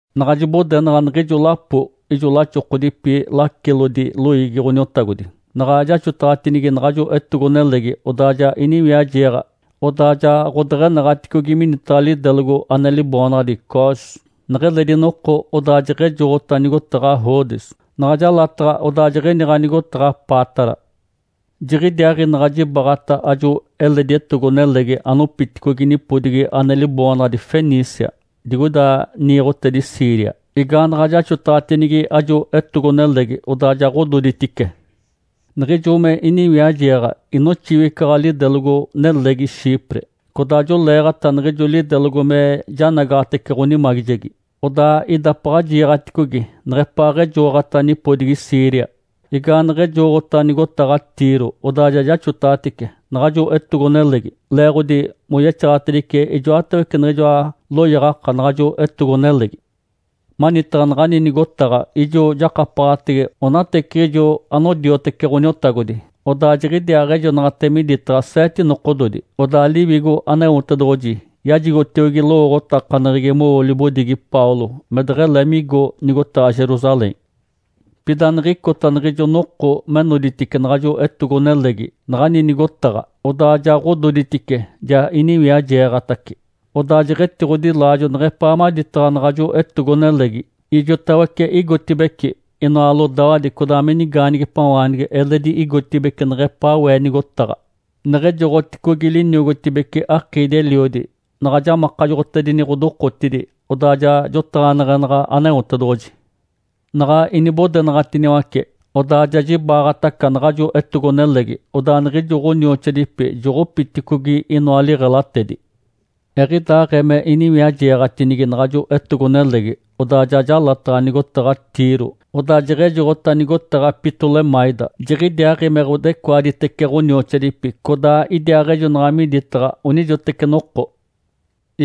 Naɡ̶a jibodenaɡ̶a niɡ̶ijo lapo ijo laxokodipi lacilodi loiigi Ǥoniotagodi, naɡ̶a jaxotaɡ̶atinigi naɡ̶ajo etogo-nelegi, odaa ja iniwiajeeɡ̶a. Odaa ja ɡ̶odeɡ̶enaɡ̶aticogi minitaɡ̶a lidelogo ane liboonaɡ̶adi Cós. Neɡ̶eledi noko odaa jeɡ̶ejoɡ̶ota nigotaɡ̶a Rodes, naɡ̶a jalataɡ̶a, odaa jiɡ̶iniɡ̶a nigotaɡ̶a Pátara. Jiɡ̶idiaaɡ̶i naɡ̶a jibaɡ̶ata ajo eledi etogo-nelegi anopiticogi nipodigi ane liboonaɡ̶adi Fenícia digoida niiɡ̶otedi Síria. Igaanaɡ̶a jaxotaɡ̶atinigi ajo etogo-nelegi, odaa ja ɡ̶ododitice. Niɡ̶ijo me iniwiajeeɡ̶a inoxiwicaɡ̶a lidelogo-nelegi Chipre. Codaa joleeɡ̶ata niɡ̶ijo lidelogo me janagaɡ̶atece ɡ̶onimagijegi, odaa idapaɡ̶a jiiɡ̶aticogi neɡ̶epaaɡ̶ejoɡ̶ota nipodigi Síria. Igaaneɡ̶ejoɡ̶ota nigotaɡ̶a Tiro, odaa ja jaxotaɡ̶atice naɡ̶ajo etogo-nelegi, leeɡ̶odi moyexaɡ̶atedice ijoatawece niɡ̶ijoa loyaɡ̶aka naɡ̶ajo etogo-nelegi. Manitaɡ̶a naɡ̶ani nigotaɡ̶a ijo jakapaɡ̶atege onateciɡ̶ijo anodiotece Ǥoniotagodi, odaa jiɡ̶idiaaɡ̶ejonaɡ̶ate miditaɡ̶a seete nokododi. Odaa Liwigo Aneotedoɡ̶oji yajigotiogi lowooɡ̶otakaneɡ̶egi mowo libodigi Paulo me deɡ̶ele migo nigotaɡ̶a Jerusalém. Pida niɡ̶icota niɡ̶ijo noko me noditice naɡ̶ajo etogo-nelegi naɡ̶ani nigotaɡ̶a, odaa ja ɡ̶ododitice, ja iniwiajeeɡ̶atace. Odaa jeɡ̶etiɡ̶odilaajo neɡ̶epaa maditaɡ̶a naɡ̶ajo etogo-nelegi. Ijotawece igotibeci, inoa lodawadi codaa me nigaanigipawaanigi eledi igotibeci neɡ̶epaa we nigotaɡ̶a. Neɡ̶ejoɡ̶oticogi liniogotibece akiidi-eliodi, naɡ̶a jamakajoɡ̶otedini ɡ̶odokotidi, odaa ja jotaɡ̶aneɡ̶enaɡ̶a Aneotedoɡ̶oji. Naɡ̶a inibodenaɡ̶atiniwace, odaa ja jibaɡ̶ataca naɡ̶ajo etogo-nelegi, odaa niɡ̶ijo ɡ̶onioxoadipi joɡ̶opiticogi inoa liɡ̶elatedi. Eɡ̶idaaɡ̶ee me iniwiajeeɡ̶atinigi naɡ̶ajo etogo-nelegi, odaa ja jalataɡ̶a nigotaɡ̶a Tiro, odaa jeɡ̶ejoɡ̶ota nigotaɡ̶a Ptolemaida. Jiɡ̶idiaaɡ̶i me ɡ̶odecoaditece ɡ̶onioxoadipi codaa idiaaɡ̶ejonaɡ̶a miditaɡ̶a onijoteci noko.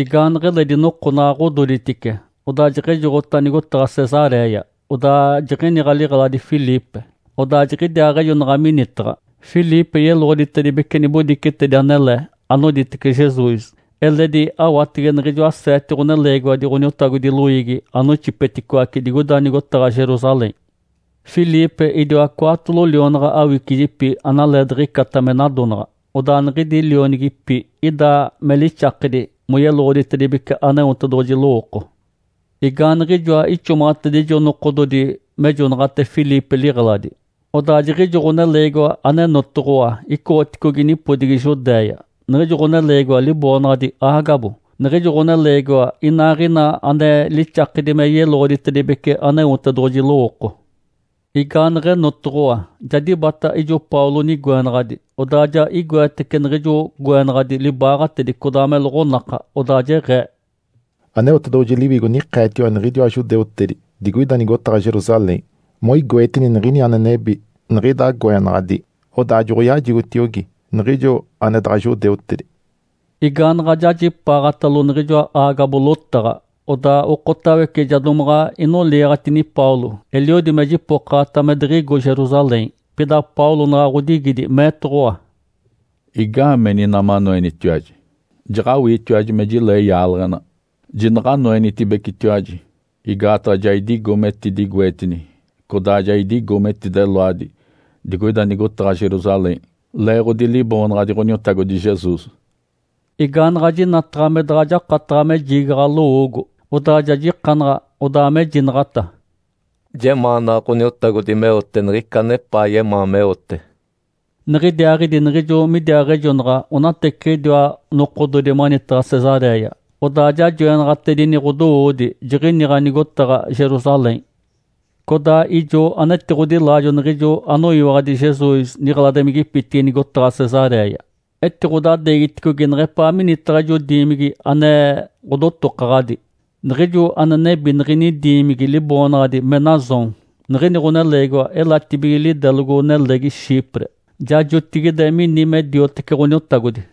Igaaneɡ̶eledi noko naɡ̶a ɡ̶ododitice, odaa jeɡ̶ejoɡ̶ota nigotaɡ̶a Cesaréia. Odaa jiɡ̶iniɡ̶a liɡ̶eladi Filipe, odaa jiɡ̶idiaaɡ̶ejonaɡ̶a minitaɡ̶a. Filipe yeloɡ̶oditedibece nibodicetedi anele anoditece Jesus, eledi awatege niɡ̶ijoa seete ɡ̶oneleegiwadi Ǥoniotagodi loiigi anoixipeticoace digoida nigotaɡ̶a Jerusalém. Filipe idiwa cwaatolo lionaɡ̶a awicijipi analee diɡ̶icata me nadonaɡ̶a. Odaa niɡ̶idi lionigipi ida me lixakedi moyeloɡ̶oditedibece Aneotedoɡ̶oji lowooko. Igaaniɡ̶ijoa ixomaɡ̶atedijo nokododi mejonaɡ̶ate Filipe liɡ̶eladi, odaa jiɡ̶ijo ɡ̶oneleegiwa anenotoɡ̶owa icoɡ̶oticogi nipodigi Judéia, niɡ̶ijo ɡ̶oneleegiwa liboonaɡ̶adi Ágabo. Niɡ̶ijo ɡ̶oneleegiwa inaaɡ̶ina ane lixakedi me yeloɡ̶oditedibece Aneotedoɡ̶oji lowooko. Igaaneɡ̶enotoɡ̶owa, ja dibata ijo Paulo nigoenaɡ̶adi. Odaa ja igoetece niɡ̶ijo goenaɡ̶adi libaaɡ̶atedi codaa me loɡ̶onaka, odaa jeɡ̶ee, “Aneotedoɡ̶oji Liwigo nikeetiwa niɡ̶idiwa judeutedi digoida nigotaɡ̶a Jerusalém moigoetini niɡ̶ini ane nebi niɡ̶ida goenaɡ̶adi. Odaa joɡ̶oyajigotiogi niɡ̶ijo ane daɡ̶a judeutedi.” Igaanaɡ̶a jajipaaɡ̶atalo niɡ̶ijoa Ágabo lotaɡ̶a, odaa okotawece ja domaɡ̶a inoliiɡ̶atini Paulo, eliodi me jipokaɡ̶ata me diɡ̶igo Jerusalém. Pida Paulo naɡ̶a ɡ̶odigidi, meetoɡ̶owa, “Igaameni ina manoenitiwaji? Jaɡ̶awiitiwaji me jilee yaaleɡ̶ena. Jinaɡ̶anoenitibecetiwaji, igaataɡ̶a ja idigo metidigoetini codaa ja idigo metideloadi digoida nigotaɡ̶a Jerusalém leeɡ̶odi Liboonaɡ̶adi Ǥoniotagodi Jesus.” Igaanaɡ̶a jinataɡ̶a me daɡ̶a jakataɡ̶a me jiigaɡ̶a lowoogo, odaa ja jikanaɡ̶a, odaa mejinaɡ̶ata, “Jemaanaɡ̶a Ǥoniotagodi meote niɡ̶ica anepaa yemaa meote.” Niɡ̶idiaaɡ̶idi niɡ̶ijo midiaaɡ̶ejonaɡ̶a onateciɡ̶idiwa nokododi manitaɡ̶a Cesaréia, odaa ja joenaɡ̶atedini ɡ̶odowoodi, jiɡ̶iniɡ̶a nigotaɡ̶a Jerusalém. Codaa ijo anetiɡ̶odilaajo niɡ̶ijo anoyiwaɡ̶adi Jesus niɡ̶eladimigipitigi nigotaɡ̶a Cesaréia. Etiɡ̶odadeegiticogi neɡ̶epaa minitaɡ̶a ijo diimigi ane ɡ̶odotokaɡ̶adi. Niɡ̶ijo ane nebi niɡ̶ini diimigi liboonaɡ̶adi Menasom. Niɡ̶ini ɡ̶oneleegiwa elatibige lidelogo-nelegi Chipre, ja jotigide mini me diotece Ǥoniotagodi.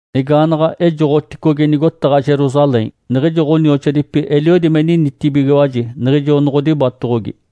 Igaanaɡ̶a ejoɡ̶oticogi nigotaɡ̶a Jerusalém, niɡ̶ijo ɡ̶onioxoadipi eliodi me ninitibigiwaji niɡ̶ijo noɡ̶odibatoɡ̶ogi.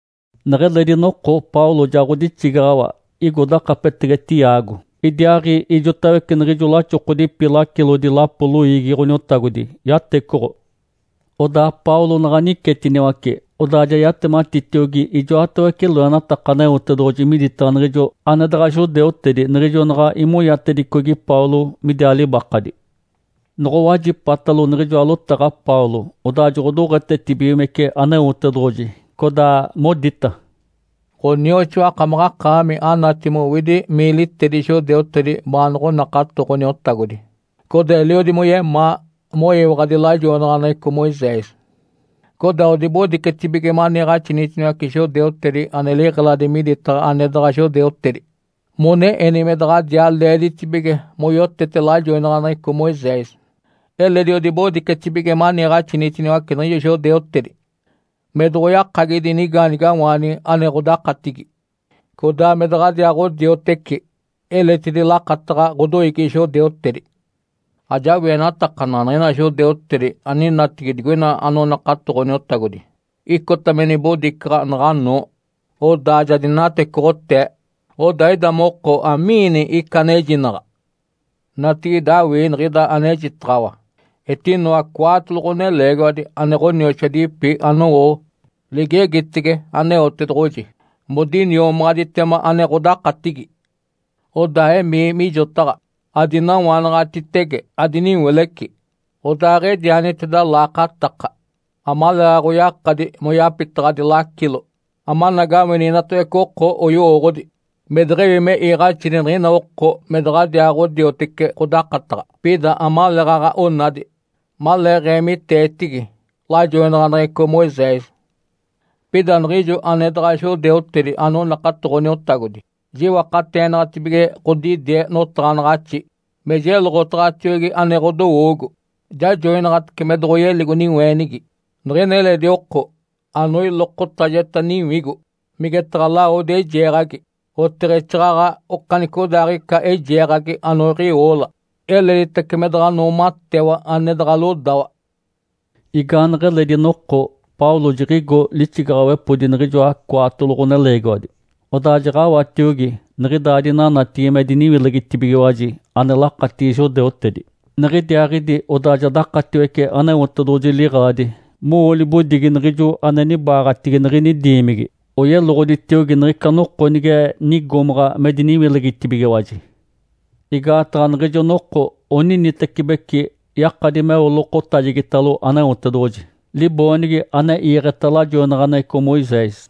Neɡ̶eledi noko Paulo ja ɡ̶odixigaɡ̶awa igo dakapetege Tiago. Idiaaɡ̶i ijotawece niɡ̶ijo laxokodipi lacilodi lapo loiigi Ǥoniotagodi yatecoɡ̶o. Odaa Paulo naɡ̶a nicetiniwace, odaa ja yatematitiogi ijoatawece loenataka Aneotedoɡ̶oji miditaɡ̶a niɡ̶ijo ane daɡ̶a judeutedi niɡ̶ijo naɡ̶a imonyatedicogi Paulo midiaa libakadi. Noɡ̶owajipatalo niɡ̶ijoa lotaɡ̶a Paulo, odaa joɡ̶odoɡ̶etetibigimece Aneotedoɡ̶oji. Codaa modita, “Ǥonioxoa, akamaɡ̶akaami anati mowidi miilitedi judeutedi baanoɡ̶onakato Ǥoniotagodi. Codaa eliodi moyemaa moyiwaɡ̶adi lajoinaɡ̶aneɡ̶eco Moisés. Codaa odibodicetibige maniiɡ̶axinitiniwace judeutedi ane liɡ̶eladi miditaɡ̶a ane daɡ̶a judeutedi mone eni me daɡ̶adiaa leeditibige moyotete lajoinaɡ̶aneɡ̶eco Moisés. Eledi odibodicetibige maniiɡ̶axinitiniwace niɡ̶ijo judeutedi me doɡ̶oyakagidi nigaanigawaanigi ane ɡ̶odakatigi, codaa me daɡ̶adiaaɡ̶odioteci eletidi lakataɡ̶a ɡ̶odoiigi judeutedi. Ajawienatakanaɡ̶a niɡ̶ina judeutedi aninatigi digoina anonakato Ǥoniotagodi icota me nibodicaɡ̶a naɡ̶anoo, odaa ja dinatecoɡ̶otee. Odaa ida moko, amiini ica anejinaɡ̶a? Natigide awii niɡ̶ida anejinaɡ̶ataɡ̶awa. Etinoa cwaatolo ɡ̶oneleegiwadi ane ɡ̶onioxoadipi anowo ligegitege Aneotedoɡ̶oji modiniomaɡ̶aditema, ane ɡ̶odakatigi. Odaa emii mijotaɡ̶a, adinawanaɡ̶atitege adiniwileci, odaaɡ̶edianiteda laakataka amaleeɡ̶aɡ̶oyakadi moyapitaɡ̶adi lacilo, amanagawini inatawece oko oyowooɡ̶odi me deɡ̶ewi me iiɡ̶axini niɡ̶ina oko me daɡ̶adiaaɡ̶odioteci ɡ̶odakataɡ̶a. Pida amaleeɡ̶aɡ̶a onadi maleeɡ̶eemiteetigi lajoinaɡ̶aneɡ̶eco Moisés. Pida niɡ̶ijo ane daɡ̶a judeutedi anonakato Ǥoniotagodi, jiwakateenaɡ̶atibige ɡ̶odidie notaɡ̶anaɡ̶axi me jeloɡ̶otaɡ̶atiogi ane ɡ̶odowoogo. Jajoinaɡ̶atece me doɡ̶oyeligo niweenigi niɡ̶ina eledi oko anoilokotajeta niwigo, migetaɡ̶a lawodi eijeeɡ̶agi, oteɡ̶exaaɡ̶aɡ̶a okanicodaaɡ̶ica eijeeɡ̶agi anoiɡ̶iwoola. Eleditace me daɡ̶a noomatewa ane daɡ̶a lodawa.” Igaaneɡ̶eledi noko Paulo jiɡ̶igo lixigaɡ̶awepodi niɡ̶ijoa cwaatolo ɡ̶oneleegiwadi, odaa jaɡ̶awatiogi niɡ̶idaa dinanatigi me diniwilegitibigiwaji, ane lakatigi judeutedi. Niɡ̶idiaaɡ̶idi odaa ja dakatiwece Aneotedoɡ̶oji liɡ̶eladi mowo libodigi niɡ̶ijo ane nibaaɡ̶atigi niɡ̶ini diimigi, oyeloɡ̶oditiogi niɡ̶ica noko nige nigomaɡ̶a me diniwilegitibigiwaji. Igaataɡ̶a niɡ̶ijo noko oninitecibeci yakadi meo lokotajegitalo Aneotedoɡ̶oji, liboonigi ane iiɡ̶eta lajoinaɡ̶aneɡ̶eco Moisés.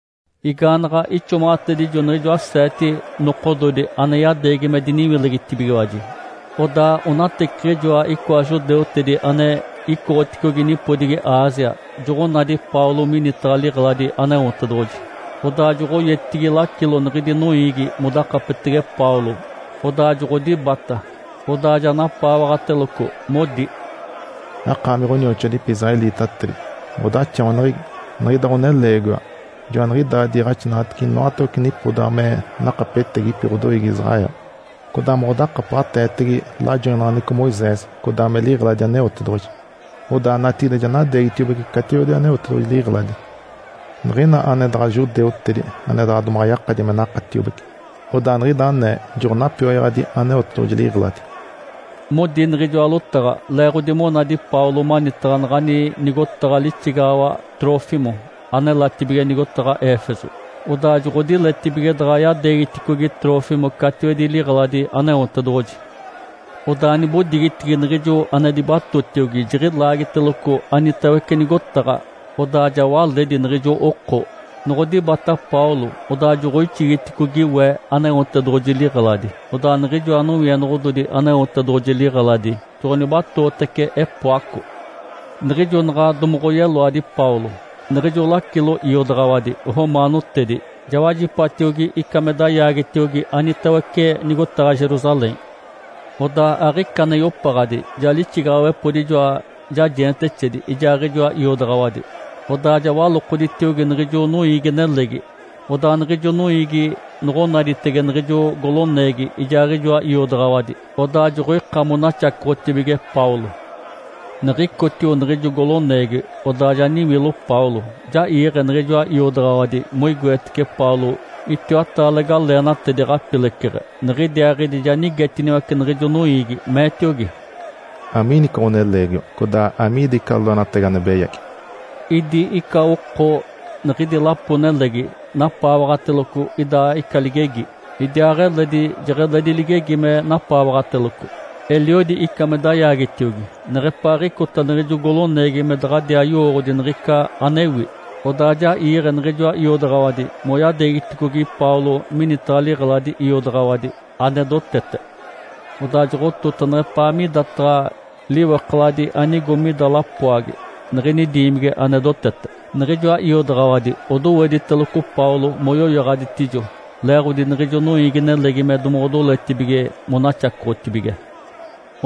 Igaanaɡ̶a ixomaɡ̶atedijo niɡ̶ijoa seete nokododi ane yadeegi me diniwilegitibigiwaji, odaa onateciɡ̶ijoa icoa judeutedi ane icoɡ̶oticogi nipodigi Ásia joɡ̶onadi Paulo minitaɡ̶a liɡ̶eladi Aneotedoɡ̶oji. Odaa joɡ̶oyetigi lacilo niɡ̶idi noiigi modakapetege Paulo, odaa joɡ̶odibata. Odaa ja napaawaɡ̶ateloco, modi, “Akaami ɡ̶onioxoadipi israelitatedi, ɡ̶odaxawaneɡ̶egi! Niɡ̶ida ɡ̶oneleegiwa joaniɡ̶idaa diiɡ̶axinaɡ̶atece inoatawece nipodaɡ̶a me nakapetegipi ɡ̶odoiigi Israel, codaa modakapaɡ̶ateetege lajoinaɡ̶aneɡ̶eco Moisés codaa me liɡ̶eladi Aneotedoɡ̶oji. Odaa natigide ja nadeegitiobece catiwedi Aneotedoɡ̶oji liɡ̶eladi niɡ̶ina ane daɡ̶a judeutedi ane daɡ̶a domaɡ̶a yakadi me nakatiobece, odaa niɡ̶ida anee joɡ̶onapioyaɡ̶adi Aneotedoɡ̶oji liɡ̶eladi.” Modi niɡ̶ijoa lotaɡ̶a leeɡ̶odi monadi Paulo manitaɡ̶a naɡ̶ani nigotaɡ̶a lixigaɡ̶awa Trófimo anelatibige nigotaɡ̶a Éfeso. Odaa joɡ̶odiletibige daɡ̶a yadeegiticogi Trófimo catiwedi liɡ̶eladi Aneotedoɡ̶oji. Odaa nibodigitigi niɡ̶ijo ane dibatotiogi jiɡ̶ilaagiteloco anitawece nigotaɡ̶a, odaa ja waledi niɡ̶ijo oko. Noɡ̶odibata Paulo, odaa joɡ̶oixigiticogi we Aneotedoɡ̶oji liɡ̶eladi, odaa niɡ̶ijoa nowienoɡ̶ododi Aneotedoɡ̶oji liɡ̶eladi joɡ̶onibatootece epoaco. Niɡ̶ijo naɡ̶a domoɡ̶oyeloadi Paulo, niɡ̶ijo lacilo iodaɡ̶awadi romaanotedi ja wajipatiogi ica me dayaagetiogi anitawece nigotaɡ̶a Jerusalém. Odaa aɡ̶ica ane yopaɡ̶adi ja lixigaɡ̶awepodi ijoa jajeentexedi ijaaɡ̶ijoa iodaɡ̶awadi, odaa ja walokoditiogi niɡ̶ijo noiigi-nelegi. Odaa niɡ̶ijo noiigi noɡ̶onaditege niɡ̶ijo goloneegi ijaaɡ̶ijoa iodaɡ̶awadi, odaa joɡ̶oika monaxacoɡ̶otibige Paulo. Niɡ̶icotio niɡ̶ijo goloneegi, odaa ja niwilo Paulo, ja iiɡ̶e niɡ̶ijoa iodaɡ̶awadi moigoetece Paulo itiwataale galeenatedi ɡ̶apileceɡ̶e. Niɡ̶idiaaɡ̶idi ja nigetiniwace niɡ̶ijo noiigi, meetiogi, “Amiini ica ɡ̶oneleegiwa? Codaa amiida ica loenatagi ane beyagi?” Idi ica oko niɡ̶idi lapo-nelegi napaawaɡ̶ateloco ida ica ligegi, idiaaɡ̶eledi jeɡ̶eledi ligegi me napaawaɡ̶ateloco. Eliodi ica me dayaagetiogi neɡ̶epaaɡ̶icota niɡ̶ijo goloneegi me daɡ̶adiaa yowooɡ̶odi niɡ̶ica anewi. Odaa ja iiɡ̶e niɡ̶ijoa iodaɡ̶awadi moyadeegiticogi Paulo minitaɡ̶a liɡ̶eladi iodaɡ̶awadi ane dotete. Odaa joɡ̶otota neɡ̶epaa midataɡ̶a liwekaladi anigo mida lapoagi niɡ̶ini diimigi ane dotete. Niɡ̶ijoa iodaɡ̶awadi odowediteloco Paulo moyoyaɡ̶aditijo, leeɡ̶odi niɡ̶ijo noiigi-nelegi me domoɡ̶odoletibige monaxacoɡ̶otibige.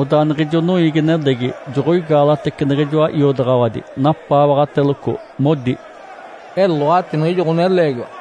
Odaa niɡ̶ijo noiigi-nelegi joɡ̶oigaalatece niɡ̶ijoa iodaɡ̶awadi, napaawaɡ̶ateloco, modi, “Eloati niɡ̶ijo ɡ̶oneleegiwa!”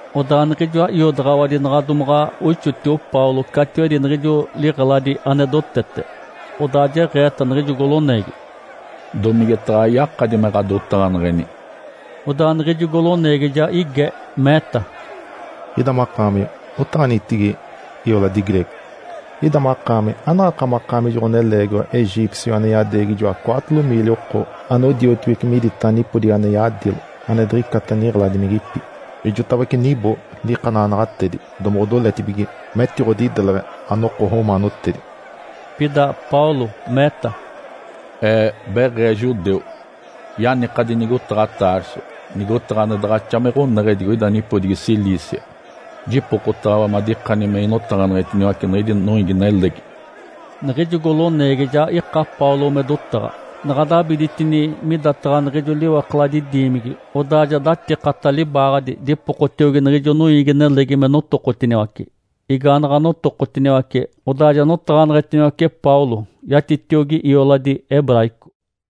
Odaa niɡ̶ijoa iodaɡ̶awadi naɡ̶a domaɡ̶a oixotio Paulo catiwedi niɡ̶ijo liɡ̶eladi ane dotete, odaa jeɡ̶eeta niɡ̶ijo goloneegi, “Domigetaɡ̶a yakadi me ɡ̶adotaɡ̶aneɡ̶eni?” Odaa niɡ̶ijo goloneegi ja ige, meeta, “Ida makaami otaɡ̶anitigi ioladi greego? Ida makaami, anaɡ̶akamaɡ̶akaami ijo ɡ̶oneleegiwa egípcio ane yadeegi ijoa cwaatolo miili oko anodiotibeci miditaɡ̶a nipodigi ane yadilo ane diɡ̶icata niɡ̶eladimigipi? Ijotawece nibo likanaɡ̶anaɡ̶atedi domoɡ̶odoletibige metiɡ̶odideleɡ̶e anoko romaanotedi.” Pida Paulo meeta, “Ee beɡ̶ee judeu, yanikadi nigotaɡ̶a Tarso, nigotaɡ̶a ane daɡ̶axa me ɡ̶oneɡ̶e digoida nipodigi Cilícia. Jipokotaɡ̶awa madikani me inotaɡ̶aneɡ̶etiniwace niɡ̶idi noiigi-nelegi.” Niɡ̶ijo goloneegi ja ika Paulo me dotaɡ̶a. Naɡ̶a dabiditini midataɡ̶a niɡ̶ijo liwekaladi diimigi, odaa ja datikata libaaɡ̶adi dipokotiogi niɡ̶ijo noiigi-nelegi me notokotiniwace. Igaanaɡ̶a notokotiniwace, odaa ja notaɡ̶aneɡ̶etiniwace Paulo yatitiogi ioladi hebraico.